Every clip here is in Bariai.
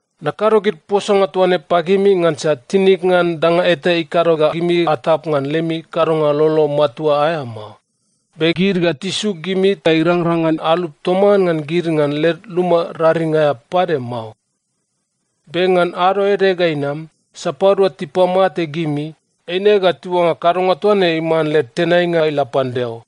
“Nakado gid posanga toa ne pagimi ngansa tinig ngan danga eta ikado ga gimi atap ngan lemi kadonga lolo matua aea mao. Be gid ga tisuk gimi ta irangrang ngan alup toman ngan gid ngan led luma raring aea pade mao. Be ngan ado ede ga inam, sapadua tipamate gimi, eine ga tiuangga kadonga toa ne iman led tenainga ila pan Deo.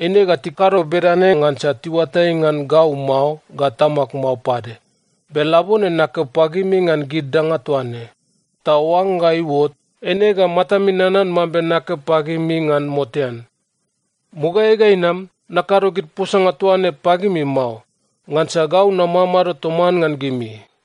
Eine ga tikado bedane ngansa tiuatai ngan gau mao ga Tamag mao pade. Be labone nakeo pagimi ngan gid danga toa ne. Ta oangga iuot, eine ga matami nanan mambe nakeo pagimi ngan motean. Mugaeai ga inam, nakado gid posanga toa ne pagimi mao, ngansa gau namamado toman ngan gimi.”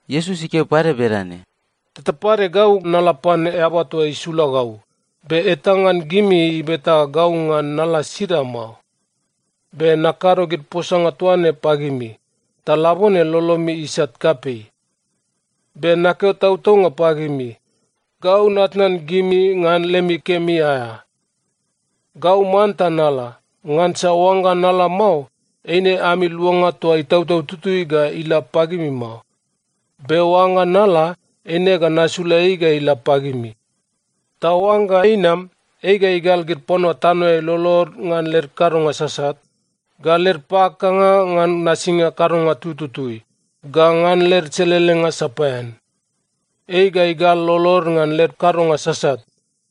Iesus ikeo pade bedane, “Teta pade gau nala pan Eaba toa isula gau, be eta ngan gimi ibeta gau ngan nala sida mao. Be nakado gid posanga toa ne pagimi, ta labone lolomi isat kapei. Be nakeo tautaunga pagimi, gau natnan gimi ngan lemi kemi aea. Gau manta nala, ngansa oangga nala mao, eine ami Luanga toa Itautau Tutui ga ila pagimi mao. Be oangga nala, eine ga nasula ei ga ila pagimi. Ta oangga inam, ei ga igal gid panua tanoeai lolod ngan led kadonga sasat, ga led pakakanga ngan nasinga kadonga tututui, ga ngan led selelenga sapaean. Ei ga igal lolod ngan led kadonga sasat,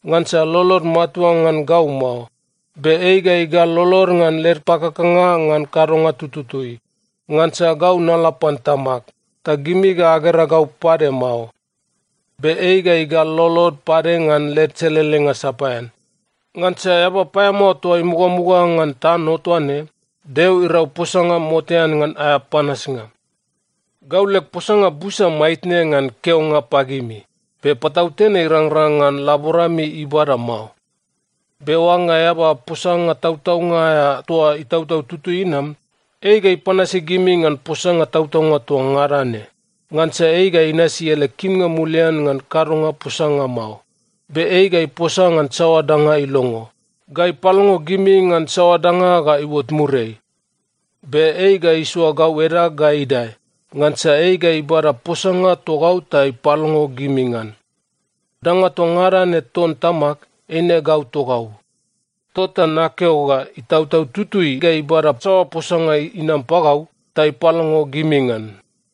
ngansa lolod matua ngan gau mao. Be ei ga igal lolod ngan led pakakanga ngan kadonga tututui, ngansa gau nala pan Tamag, ta gimi ga agera gau pade mao. Be ei ga igal lolod pade ngan led selelenga sapaean, ngansa eaba paeamao toa imugamuga ngan tano toa ne, Deo irau posanga motean ngan aea panasnga. “Gau leg posanga busa maitne ngan keonga pagimi, be patautene irangrang ngan laborami ibada mao. Be oangga Eaba posanga tautaunga aea toa Itautau Tutui inam, ei ga ipanasi gimi ngan posanga tautaunga toa ngada ne. Ngansa ei ga inasi ele kimnga mulian ngan kadonga posanga mao. Be ei ga iposa ngan saoa danga ilongo, ga ipalongo gimi ngan saoa danga ga iuot muriai. Be ei ga isoa gau edag ga idae, ngansa ei ga ibada posanga togau ta ipalongo gimi ngan. Danga toa ngada ne ton Tamag, eine gau togau. Tota nakeo ga Itautau Tutui ga ibada saoa posanga inam pagau, ta ipalongo gimi ngan.”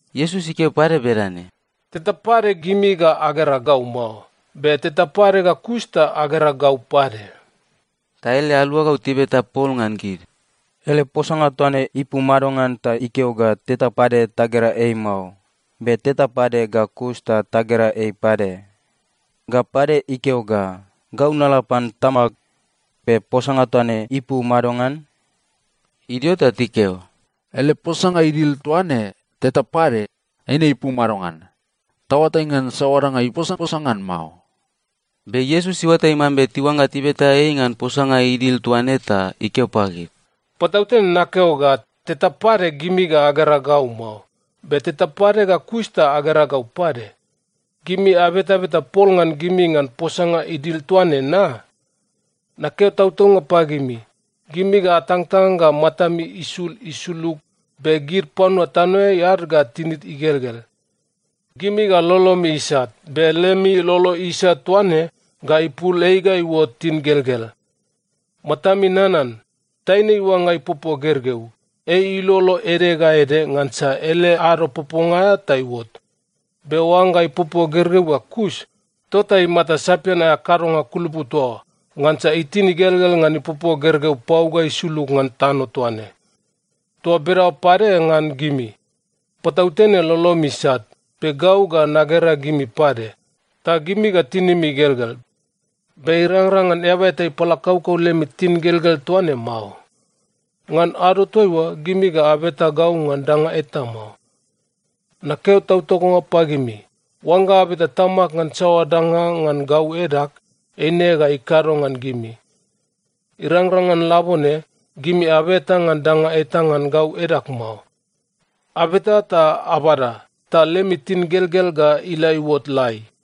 Iesus ikeo pade bedane, “Teta pade gimi ga agera gau mao. Be teta pade ga kus ta agera gau pade.” Ta ele aluagau tibeta pol ngan gid, “Ele posanga toa ne ipu madongan ta ikeo ga teta pade tagera ei mao, be teta pade ga kus ta tagera ei pade? Ga pade ikeo ga, ‘Gau nala pan Tamag,’ be posanga toa ne ipu madongan?” Idio ta tikeo, “Ele posanga idil toa ne, ‘Teta pade,’ eine ipu madongan? Taoatai ngan saoa danga iposaposa ngan mao.” Be Iesus iuatai mambe tiuangga tibeta ei ngan posanga idil toa ne ta ikeo pagid, “Patautene nakeo ga teta pade gimi ga agera gau mao, be teta pade ga kus ta agera gau pade. Gimi abetabeta pol ngan gimi ngan posanga idil toa ne, na? Nakeo tautaunga pagimi, gimi ga atangtang ga matami isul isulug, be gid panua tanoeai ad ga tinid igelgel. Gimi ga lolomi isat, be lemi lolo isat toa ne ga ipul ei ga iuot tingelgel. Matami nanan, taine iuangga ipopo gergeu, ei ilolo ede ga ede ngansa ele ado poponga aea ta iuot. Be oangga ipopo gergeu ga kus, tota imata sapian aea kadonga kulupu toa oa, ngansa itin igelgel ngan ipopo gergeu pau ga isulug ngan tano toa ne. Toa bedaoa pade ngan gimi. Patautene lolomi isat, be gau ga nagera gimi pade. Ta gimi ga tinimi igelgel. Be irangrang ngan eaba eta ipalakaukau lemi tingelgel toa ne mao. Ngan ado toaiua, gimi ga abeta gau ngan danga eta mao. Nakeo tautaunga pagimi, oangga abeta Tamag ngan saoa danga ngan gau edag, eine ga ikado ngan gimi. Irangrang ngan labone, gimi abeta ngan danga eta ngan gau edag mao. Abeta ta abada, ta lemi tingelgel ga ila iuot lai.”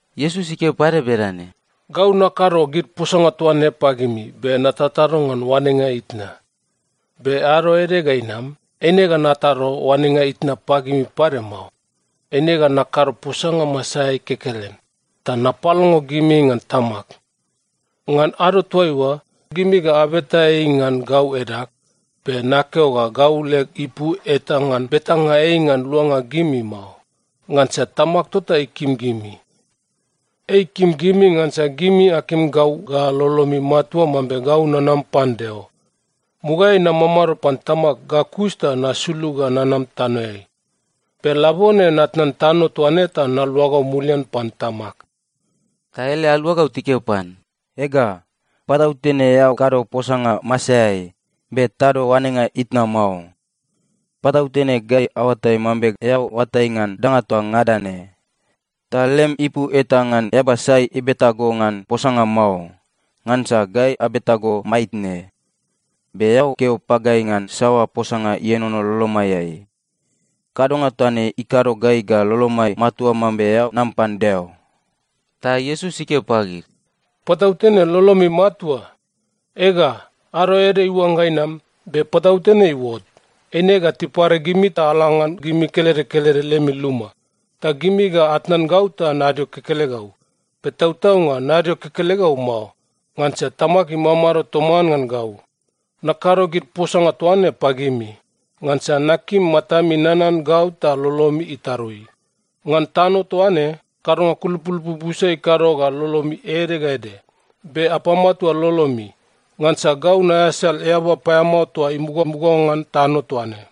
Iesus ikeo pade bedane, “Gau nakado gid posanga toa ne pagimi be natatado ngan oanenga itna. Be ado ede ga inam, eine ga natado oanenga itna pagimi pade mao. Eine ga nakado posanga masaeai kekelen, ta napalongo gimi ngan Tamag. Ngan ado toaiua, gimi ga abeta ei ngan gau edag. Be nakeo ga gau leg ipu eta ngan betanga ei ngan luanga gimi mao. Ngansa Tamag tota ikim gimi. Ei ikim gimi ngansa gimi akim gau ga lolomi matua mambe gau nanam pan Deo. Mugaeai namamado pan Tamag ga kus ta nasulug ga nanam tanoeai. Be labone natnan tano toa ne ta naluagau mulian pan Tamag.” Ta ele aluagau tikeo pan, “Ega, patautene eao kado posanga masaeai, be tado oanenga itna mao. Patautene gai aoatai mambe eao oatai ngan danga toa ngada ne, ta lem ipu eta ngan eaba sai ibeta go ngan posanga mao. Ngansa gai abeta go maitne, be eao keo pagai ngan saoa posanga ienono lolomaiai. Kadonga toa ne ikado gai ga lolomai matua mambe eao nam pan Deo.” Ta Iesus ikeo pagid, “Patautene lolomi matua? Ega, ado ede iuangga inam, be patautene iuot, eine ga tipare gimi ta ala ngan gimi kelede kelede lemi luma. Ta gimi ga atnan gau ta nadio kekelegau. Be tautaunga nadio kekelegau mao, ngansa Tamag imamado toman ngan gau. “Nakado gid posanga toa ne pagimi, ngansa nakim matami nanan gau ta lolomi itarui. Ngan tano toa ne, kadonga kulupulupu busa ikado ga lolomi ede ga ede. Be apamatua lolomi! Ngansa gau naeasal eaba paeamao toa imugamuga ngan tano toa ne.”